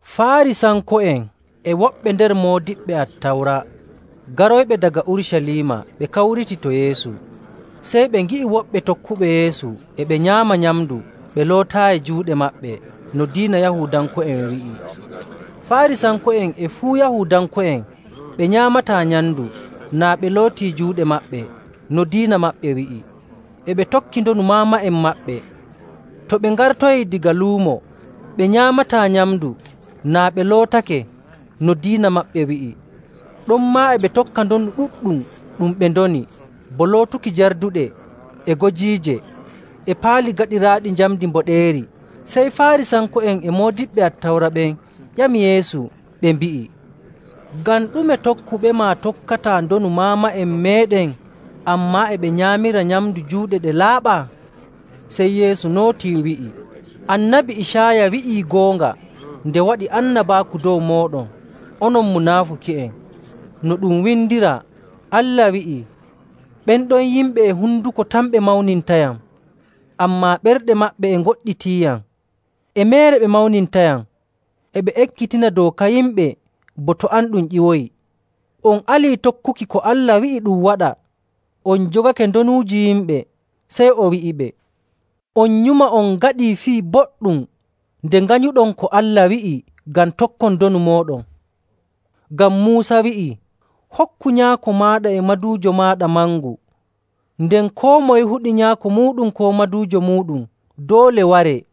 Faarisanko'en e woɓɓe nder moodiɓɓe Attawra garoyɓe daga Urucaliima ɓe kawriti to Yeesu. Sey ɓe ngi'i woɓɓe tokkuɓe Yeesu e ɓe nyaama nyamndu ɓe lootaayi juuɗe maɓɓe no diina Yahuudanko'en wi'i. Faarisanko'en e fuu Yahuudanko'en ɓe nyaamataa nyamndu naa ɓe lootii juuɗe maɓɓe no diina maɓɓe wi'i, e ɓe tokki ndonu maama'en maɓɓe. To ɓe ngartoyii daga luumo, ɓe nyaamataa nyamndu naa ɓe lootake no diina maɓɓe wi'i. Ɗonmaa e ɓe tokka ndonu ɗuɗɗum ɗum ɓe ndoni, bo lootuki jarduɗe, e gojiije, e paali gaɗiraaɗi njamndi mboɗeeri. Sey Faarisanko'en e moodiɓɓe Attawra ɓen ƴami Yeesu ɓe mbi'i, “Ngam ɗume tokkuɓema tokkataa ndonu maama'en meeɗen, ammaa e ɓe nyaamira nyamndu juuɗe ɗe laaɓaa?” Sey Yeesu nootii wi'i, “Annabi Icaaya wi'ii goonga nde waɗi annabaaku dow mooɗon, onon munaafuki'en, no ɗum windiraa, Allah wi'ii, ‘Ɓen ɗon yimɓe e honduko tan ɓe mawnintayam, ammaa ɓerɗe maɓɓe e ngoɗɗitiiyam. E meere ɓe mawnintayam; E ɓe ekkitina dooka yimɓe bo to am ɗum ƴiwoyi.’. “On alii tokkuki ko Allah wi'i ɗum waɗa, on njogake ndonuuji yimɓe.” Sey o wi'iɓe, “On nyuma on ngaɗii fii boɗɗum nde nganyuɗon ko Allah wi'i ngam tokkon ndonu mooɗon. Ngam Muusa wi'ii, ‘Hokku nyaako maaɗa e maduujo maaɗa mangu,’ nden, ‘Koo moye huɗi nyaako muuɗum koo maduujo muuɗum doole waree.’.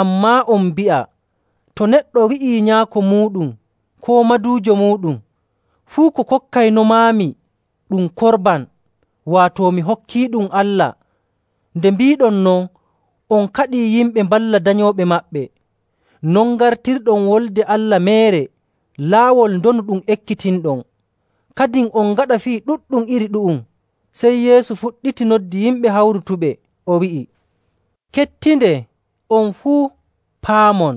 Ammaa on mbi'a to neɗɗo wi'ii nyaako muuɗum koo maduujo muuɗum, ‘Fuu ko kokkaynomaami, ɗum Korban, waato mi hokkiiɗum Allah,’ nde mbiiɗon non on kaɗii yimɓe mballa danyooɓe maɓɓe. Non ngartirɗon Wolde Allah meere laawol ndonu ɗum ekkitinɗon. Kadin on ngaɗa fii ɗuɗɗum iri ɗu'um.” Sey Yeesu fuɗɗiti noddi yimɓe hawrutuɓe, o wi'i, “Kettindee, on fuu, paamon.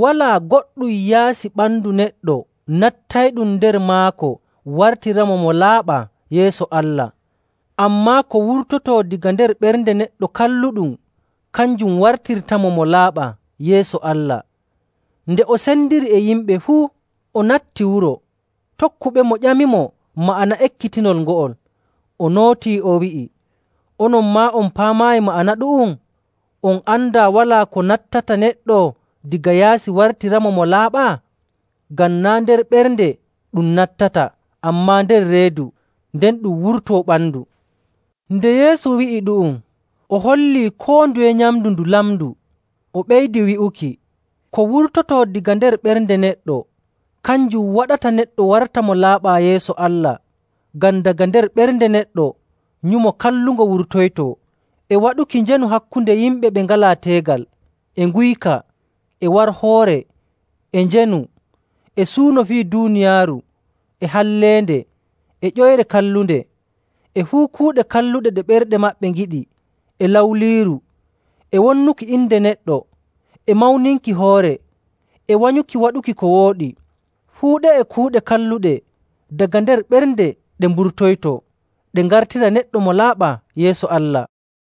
Walaa goɗɗum yaasi ɓandu neɗɗo nattayɗum nder maako wartiramo mo laaɓaa yeeso Allah. Ammaa ko wurtoytoo daga nder ɓernde neɗɗo kalluɗum kanjum wartirtamo mo laaɓaa yeeso Allah.” Nde o sendiri e yimɓe fuu, o natti wuro, tokkuɓemo ƴamimo ma'ana ekkitinol ngo'ol. O nootii o wi'i, “Onon maa on paamaayi ma'ana ɗu'um? On andaa walaa ko nattata neɗɗo daga yaasi wartiramo mo laaɓaa? Ngam naa' nder ɓernde ɗum nattata, ammaa nder reedu, nden ɗum wurto ɓandu.” (Nde Yeesu wi'i ɗu'um, o hollii koo nduye nyamndu ndu lamndu.) O ɓeydi wi'uki, “Ko wurtotoo daga nder ɓernde neɗɗo, kanjum waɗata neɗɗo warta mo laaɓaa yeeso Allah. Ngam daga nder ɓernde neɗɗo nyumo kallungo wurtoytoo, e waɗuki njeenu hakkunde yimɓe ɓe ngalaa teegal, e nguyka, e warhoore, e njeenu, e suuno fii duuniyaaru, e halleende, e ƴoyre kallunde, e fuu kuuɗe kalluɗe ɗe ɓerɗe maɓɓe ngiɗi, e lawliiru, e wonnuki inde neɗɗo, e mawninki hoore, e wanyuki waɗuki ko wooɗi. Fuu ɗe'e kuuɗe kalluɗe daga nder ɓernde ɗe mburtoytoo ɗe ngartira neɗɗo mo laaɓaa yeeso Allah.”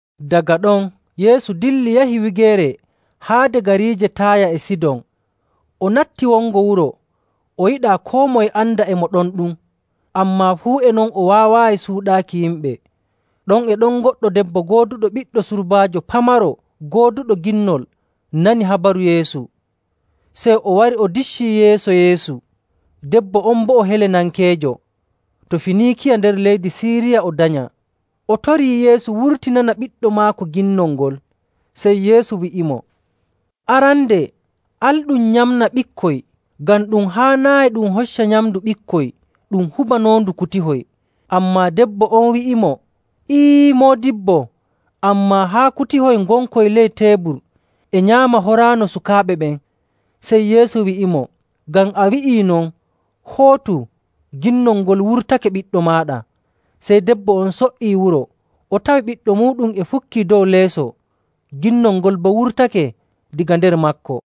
Daga ɗon Yeesu dilli yahi wigeere haade gariije Taaya e Sidon. O natti wongo wuro, o yiɗaa koo moye anda e mo ɗon ɗum. Ammaa fuu e non o waawaayi suuɗaaki yimɓe. Ɗon e ɗon goɗɗo debbo gooduɗo ɓiɗɗo surbaajo pamaro gooduɗo ginnol nani habaru Yeesu. Sey o wari o diccii yeeso Yeesu. Debbo on boo o Helenankeejo to Finiikiya nder leydi Siiriya o danyaa. O torii Yeesu wurtinana ɓiɗɗo maako ginnol ngol. Sey Yeesu wi'imo, “Arande al ɗum nyamna ɓikkoy, ngam ɗum haanaayi ɗum hocca nyamndu ɓikkoy ɗum hubanoondu kutihoy.” Ammaa debbo on wi'imo, “Ee, Moodibbo, ammaa haa kutihoy ngonkoy ley teebur e nyaama horaano sukaaɓe ɓen.” Sey Yeesu wi'imo, “Ngam a wi'ii non, hootu, ginnol ngol wurtake ɓiɗɗo maaɗa.” Sey debbo on so''ii wuro tawi ɓiɗɗo muuɗum e fukkii dow leeso, ginnol ngol boo wurtake daga nder maako.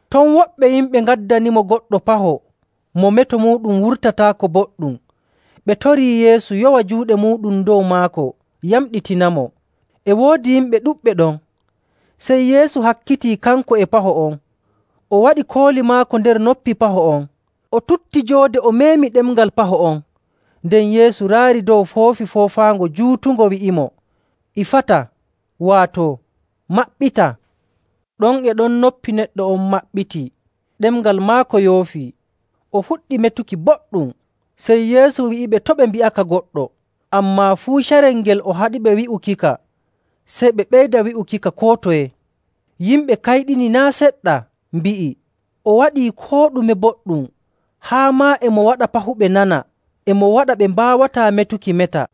Ton woɓɓe yimɓe ngaddanimo goɗɗo paho mo meto muuɗum wurtataako boɗɗum. Ɓe torii Yeesu yowa juuɗe muuɗum dow maako yamɗitinamo. E woodi yimɓe ɗuɗɓe ɗon, sey Yeesu hakkitii kanko e paho on, o waɗi kooli maako nder noppi paho on. O tutti joode o meemi ɗemngal paho on. Nden Yeesu raari dow foofi foofaango juutungo wi'imo, “Ifata,” waato, “Maɓɓita!” Ɗon e ɗon noppi neɗɗo on maɓɓitii, ɗemngal maako yoofii, o fuɗɗi metuki boɗɗum. Sey Yeesu wi'iɓe to' ɓe mbi'aka goɗɗo. Ammaa fuu carel ngel o haɗiɓe wi'ukika, sey ɓe ɓeyda wi'ukika koo toye. Yimɓe kayɗini naa' seɗɗa mbi'i, “O waɗii koo ɗume boɗɗum, haa maa e mo waɗa pahuɓe nana, e mo waɗa ɓe mbaawataa metuki meta.”